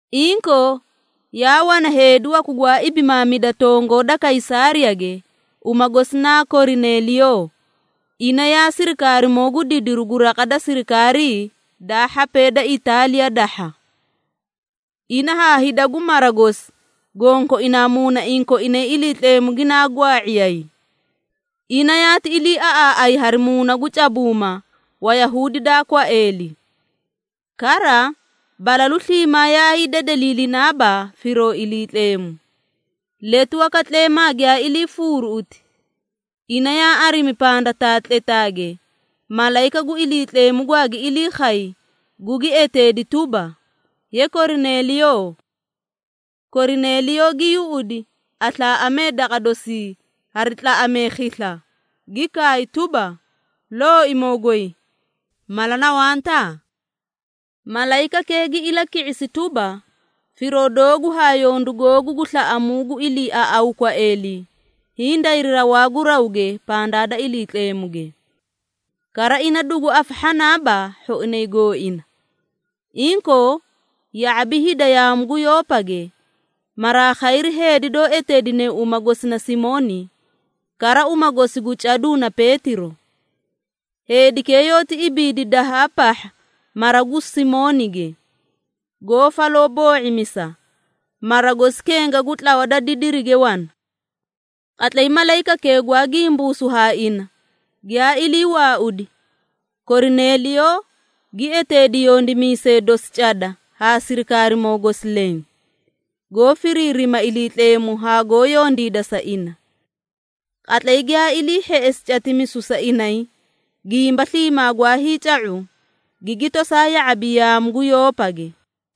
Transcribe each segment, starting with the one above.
Inkoo yaa wana heedi waku gwaa ibimaamida tongoo da Kaysaariyage, uma gosi naa Korineliyoo, ina yaa sirikaarimoo gu didiru gu raqa da sirikaarii daa hhapee da Itaaliya dahha. Ina haa hida gu mara gosi gonkoinaa muunaiĩ koinay Iliitleemu ginaa gwaa⁄iyay. Ina yaati iliiaꞌaaꞌay hari muuna gu cabuuma Wayahuudi daa kwaeeli. Kara balalu sliimaa yaa hiidedeliilinaaba firoo Iliitleemu. Letu waka tleemaa giyaa iliifuuruꞌuti, ina yaa arimi pandataa tletaage, malayika gu Iliitleemu gwaagi ilii khay, gugi eteedi tuba, “Ye Korineliyoo!” Korineliyoo gi yuꞌudi aslaaꞌamee daqa dosii hari tlaꞌamee khisla, gi kaay tuba, “Looimoo goy, mala na wanta?” Malayikakee gi ilaki⁄isi tuba, “Firoo doogu haa yondu googu gu slaꞌamuu gu iliiaꞌawuu kwaeeli, hiĩ dayri rawaa gu rawge pandaa da Iliitleemuge. Kara ina dugu afahhanaaba hhoinay gooina. Inkoo, ya⁄abi hida yaamu gu Yoopage, maraa khayri heedi doó eteedine uma gosi na Simooni, kara uma gosi gu caduu na Peetiro. Heedikee yoóti ibiidi dahaa pahha mara gu Simoonige, goó faloo boo⁄imisa, mara gosi kenga gu tlawa da didirige wana.” Qatlay malayikakee gwaa gimbuusu haa ina, giyaa ilii waaudi, Korineliyoo gi eteedi yondimiisee dosi cada haa sirikaarimoo gosi leẽ, goó firiirima Iliitleemu haa goó yondiida sa ina. Qatlay giyaa ilii hheꞌesi catimisu sa inay gimba sliimaa gwa hiica⁄u, gigi tosaa ya⁄abi yaamu gu Yoopage.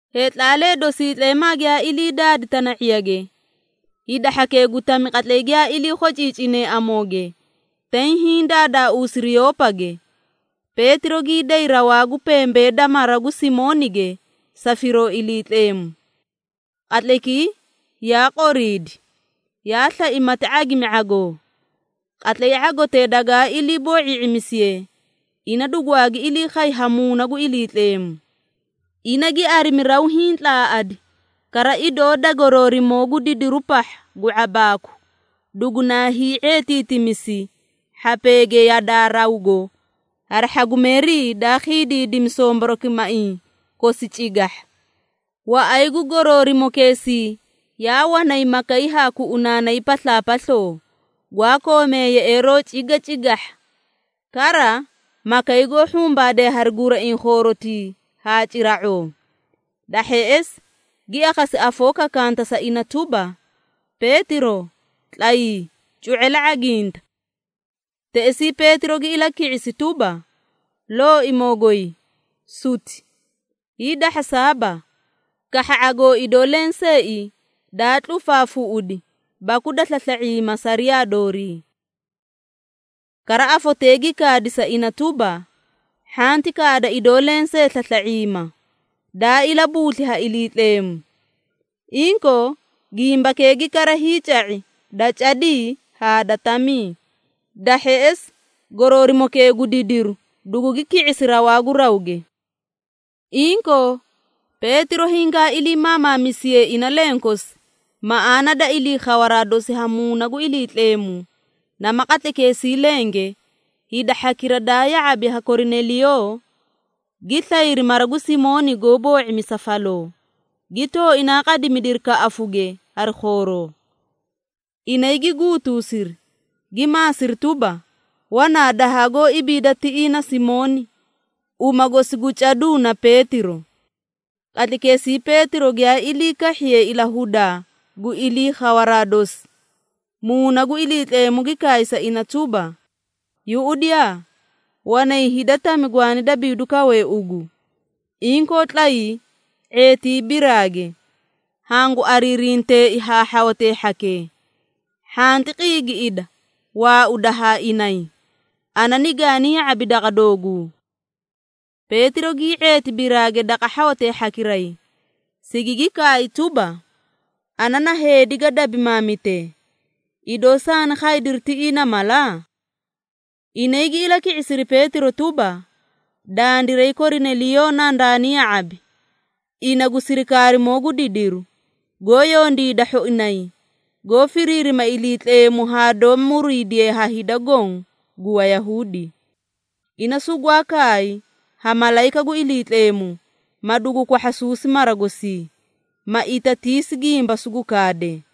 Heetlaalee dosii tleemaa giyaa ilii daadi tana⁄iyage, hida hhakee gu tami qatlay giyaa ilii khociicinee amooge, tay hiĩ daadaauusiri Yoopage, Peetiro gii day rawaa gu pembee da mara gu Simoonige sa firoo Iliitleemu. Qatlaykii yaa qoriidi, yaa slai mati ⁄agimi ⁄agoo. Qatlay ⁄agotee dagaa ilii boo⁄ii⁄imisiye, ina dugwaagi ilii khay ha Muuna gu Iliitleemu. Ina gi arimi raw hiĩ tlaaꞌadi, kara idoo da goroorimoo gu didiru pahha gu ⁄abaaku, dugunaa hii⁄eetiitimisi hhapeege yadaa rawgo hari hhagumeerii daa khiidiidimi somborokimaiĩ kosi cigahha. Waꞌay gu goroorimokeesii yaa wanay makay haa kuꞌunaanay paslaapasloo, gwaa koomee yeꞌeeroo cigacigahha, kara makay goó hhumbaadee hari guraiĩ khoorotii haa cira⁄oo. Da hheꞌesi, gi akhasi afoo kakanta sa ina tuba, “Peetiro tlayii, cu⁄e la ⁄aginta.” Teꞌesii Peetiro gi ilaki⁄isi tuba, “Looimoo goy, suti! Hiidahhasaaba, kahha ⁄agoo idoo lenseei daa tlufaafuꞌudi baku da slasla⁄iima sariyaa doorii.” Kara afotee gi kaadi sa ina tuba, “Hhanti kaada idoo lensee slasla⁄iima, daa ilabuusli ha Iliitleemu.” Inkoo gimbakee gi kara hiica⁄i da cadii haa da tamii. Da hheꞌesi, goroorimokee gu didiru dugugi ki⁄isi rawaa gu rawge. Inkoo, Peetiro hingaa ilii maamaamisiye ina lenkosi maꞌaana da ilii khawaraa dosi ha Muuna gu Iliitleemu, nama qatlaykeesii lenge, hida hhakira daa ya⁄abi ha Korineliyoo, gi slayri mara gu Simooni goó boo⁄imisa faloo, gi tooinaa qadimidiri kaꞌafuge hari khooroo. Inay gi guutusiri, gi maasiri tuba, wanaa dahaa goó ibiida tiꞌii na Simooni, uma gosi gu caduu na Peetiro. Qatlaykeesii Peetiro giyaa ilii kahhiye ilahudaa gu ilii khawaraa dosi, Muuna gu Iliitleemu gi kaay sa ina tuba, “Yuꞌudiyaa, wanay hida tami gwaani dabiidu kawee ugu. Inkoo tlayii, ⁄eetii biraage, hangu ariirinteei haa hhawatee hhakee. Hhanti qiigiꞌida waauda haa inay, ana nigaani ya⁄abi daqa dooguu.” Peetiro gii ⁄eeti biraage daqa hhawatee hhakiray, sigigi kaay tuba, “Ana na heedi ga dabimaamitee. Idoo saani khaydiri tiꞌii na mala?” Inay gi ilaki⁄isiri Peetiro tuba, “Dandiray Korineliyoo nandaani ya⁄abi, ina gu sirikaarimoo gu didiru, goó yondiida hhoinay, goó firiirima Iliitleemu haa doó muriidiye ha hida goõ gu Wayahuudi. Ina sugwaa kaay ha malayika gu Iliitleemu, ma dugu kwahhasuusi mara gosii, ma itatiisi gimba sugu kaade.”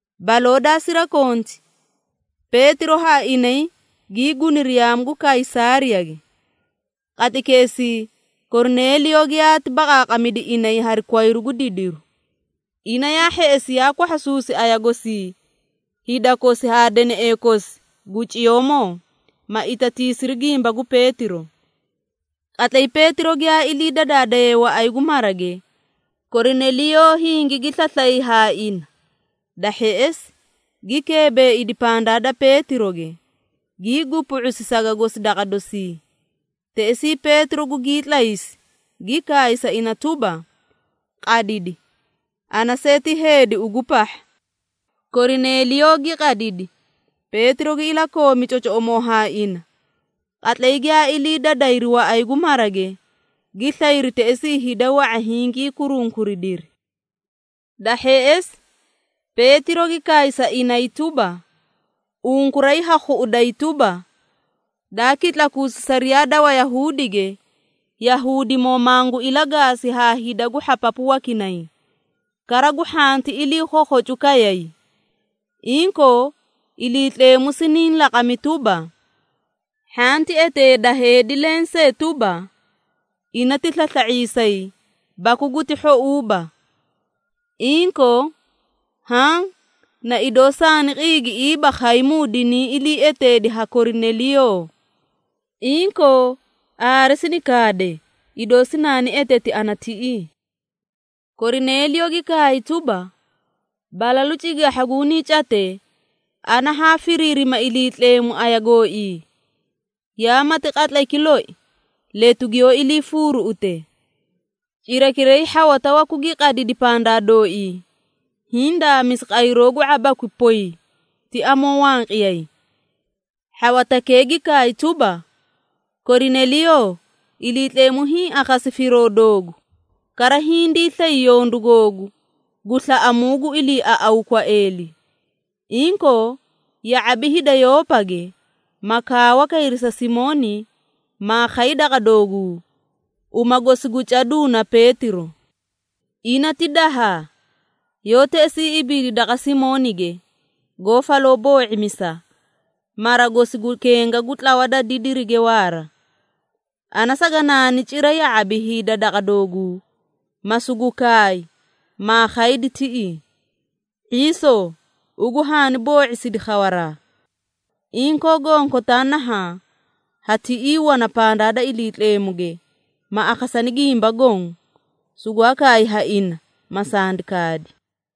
Baloo daa sirakonti, Peetiro haa inay gii guniri yaamu gu Kaysaariyage. Qatlaykeesii Korineliyoo giyaati baqaaqamidi inay hari kwayru gu didiru. Ina yaa hheꞌesi yaa kwahhasuusi aya gosii hida kosi haa deneꞌee kosi gu ciyoomoo, ma itatiisiri gimba gu Peetiro. Qatlay Peetiro giyaa ilii dadaadaye waꞌay gu marage, Korineliyoo hingigi slaslay ha ina. Da hheꞌesi, gi keebeeidi pandaa da Peetiroge, gii gupu⁄usi saga gosi daqa dosii. Teꞌesii Peetiro gugii tlaysi, gi kaay sa ina tuba, “Qadidi! Ana see ti heedi ugu pahha.” Korineliyoo gi qadidi, Peetiro gi ilakoomi cocoꞌomoo haa ina. Qatlay giyaa ilii dadayri waꞌay gu marage, gi slayri teꞌesii hida wa⁄a hingii kurunkuridiri. Da hheꞌesi, Peetiro gi kaay sa inay tuba, “Unkuray ha khuꞌuday tuba, daa kitlakuusi sariyaa da Wayahuudige, Yahuudimoo mangu ilagaasi haa hida gu hhapapu wakinay, kara gu hhanti ilii khookhocu kayay. Inkoo, Iliitleemu siniĩ laqami tuba, ‘Hhanti eteeda heedi lensee tuba, ina ti slasla⁄iisay baku guti hhouuba.’ Inkoo haã na idoo saani qiigiꞌiiba khaymuu dinii ilii eteedi ha Korineliyoo. Inkoo, aare sini kaade, idoo sinaani eteti ana tiꞌii.” Korineliyoo gi kaay tuba, “Balalu cigahha gunii catee, ana haa firiirima Iliitleemu aya gooii, yaa mati qatlayki loi, letu giyoó ilii fuuruuꞌute. Cirakiray hhawata waku gi qadidi pandaa dooii, hiĩ daamisi qayroo gu ⁄abakwi poy ti amoo wanqiyay. Hhawatakee gi kaay tuba, ‘Korineliyoo, Iliitleemu hiĩ akhasi firoo doogu, kara hindii slay yondu googu gu slaꞌamuu gu iliiaꞌawuu kwaeeli. Inkoo, ya⁄abi hida Yoopage, ma kaawa kayri sa Simooni, maa khay daqa dooguu, uma gosi gu caduu na Peetiro. Ina ti dahaa, yoó teꞌesii ibiidi daqa Simoonige, goó faloo boo⁄imisa, mara gosi gu kenga gu tlawa da didirige waara.’ Ana saganaani cira ya⁄abi hida daqa dooguu, ma sugu kaay, maa khaydi tiꞌii. ⁄iisoo, ugu haani boo⁄isidi khawaraa. Inkoo gonkotaa nahaã ha tiꞌii wana pandaa da Iliitleemuge, ma akhasani gimba goõ, sugwaa kaay ha ina, ma sandi kaadi.”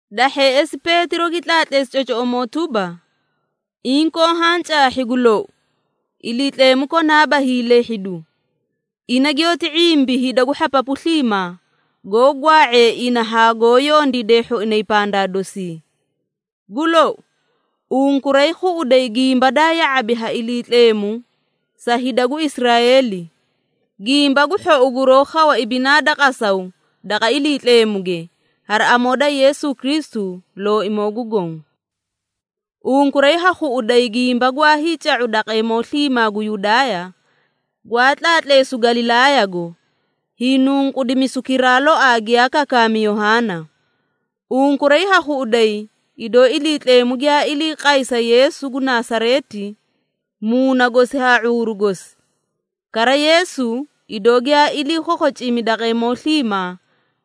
Da hheꞌesi Peetiro gi tlaatleesi cocoꞌomoo tuba, “Inkoo haã caahhi gu lou, Iliitleemu konaaba hiilehhidu, ina giyoóti ⁄imbi hida gu hhapapu sliimaa, goó gwaa⁄ee ina haa goó yondiidee hhoinay pandaa dosii. Gu lou, unkuray khuꞌuday gimba daa ya⁄abi ha Iliitleemu sa hida gu Israeeli, Gimba gu Hhou guroó khawa ibinaa da qasaw daqa Iliitleemuge, hari amoo da Yeesu Kristu, Looimoo gu Goõ. Unkuray ha khuꞌuday gimba gwaa hiica⁄u daqeemoo sliimaa gu Yudaaya, gwaa tlaatleesu Galilaayago, hiinunqudimisukiraa loaa giyaa kakaami Yohaana. Unkuray ha khuꞌuday, idoo Iliitleemu giyaa ilii qay sa Yeesu gu Nasareeti Muuna gosi haa ⁄uuru gosi. Kara Yeesu, idoo giyaa ilii khookhocimi daqeemoo sliimaa,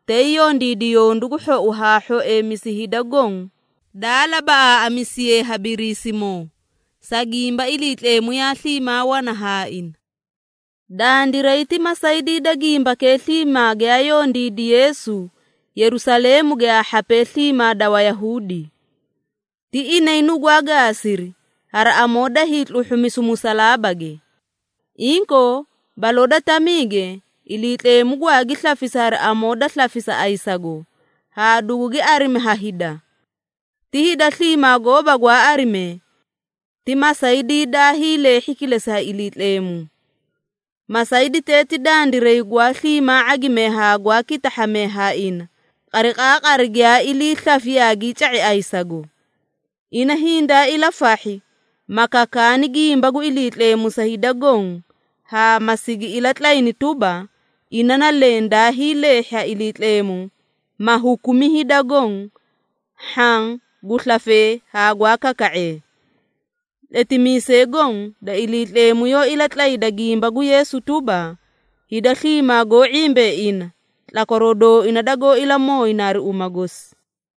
tay yondiidi yondu gu hhou haa hhoeemisu hida goõ daa labaꞌaaꞌamisiye ha Biriisimoo, sa gimba Iliitleemu yaa sliimaa wana haa ina. Dandiray ti masaydii da gimbakee sliimaa giyaa yondiidi Yeesu Yerusaleemuge haa hhapee sliimaa da Wayahuudi. Ti inay nugwaa gaasiri, hari amoo da hiitluhhumisu musalaabage. Inkoo, baloo da tamiige, Iliitleemu gwaagi slafisi hari amoo da slafisa ayisago, haa dugugi arimi ha hida. Ti hida sliimaa gooba gwaa arimee. Ti masaydii daa hiileehhi kilesi ha Iliitleemu. Masayditee ti dandiray gwaa sliimaa ⁄agimee haa gwaa kitahhamee haa ina, qariqaaqari giyaa ilii slafi yaagii ca⁄i ayisago. Ina hindaa ilafahhi, ma kakaani gimba gu Iliitleemu sa hida goõ haa ma sigi ilatlayni tuba, ina na leẽ daa hiileehhi ha Iliitleemu, ma hukumi hida goõ, hhaã gu slafee haa gwaa kaka⁄ee. Tletimiisee goõ da Iliitleemu yoó ilatlatlayda gimba gu Yeesu tuba, hida sliimaa goó ⁄imbee ina, tlakwaroo dooina dagoó ilamooyina hari uma gosi.”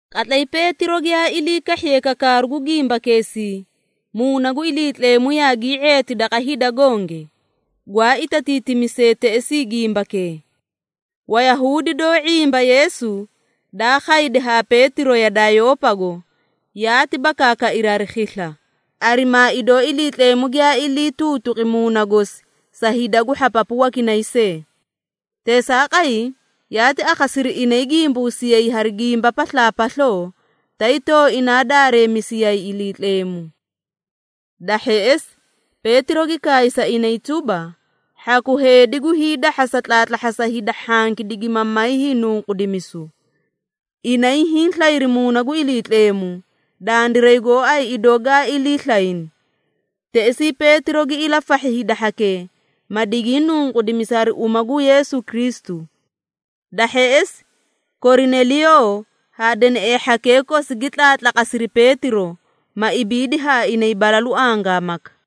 Qatlay Peetiro giyaa ilii kahhiye kakaaru gu gimbakeesii, Muuna gu Iliitleemu yaagii ⁄eeti daqa hida gonge, gwaa itatiitimisee teꞌesii gimbakee. Wayahuudi doó ⁄imba Yeesu, daa khaydi haa Peetiro yadaa Yoopago, yaati bakaakairi hari khisla, arimaa idoo Iliitleemu giyaa ilii tuutuqi Muuna gosi sa hida gu hhapapu wakinay see. Teesaaqay, yaati akhasiri inay gimbuusiyay hari gimba paslaapasloo tay tooinaa daareemisiyay Iliitleemu. Da hheꞌesi, Peetiro gi kaay sa inay tuba, “Hhaku heedi gu hiidahhasa tlaatlahhasa hida hhanki digima may hiinunqudimisu. Inay hiĩ slayri Muuna gu Iliitleemu, dandiray gooay idoo gaa ilii slayni.” Teꞌesii Peetiro gi ilafahhi hida hhakee, ma digii nunqudimisi hari uma gu Yeesu Kristu. Da hheꞌesi, Korineliyoo haa deneꞌee hhakee kosi gi tlaatlaqasiri Peetiro, ma ibiidi haa inay balalu angaamaka.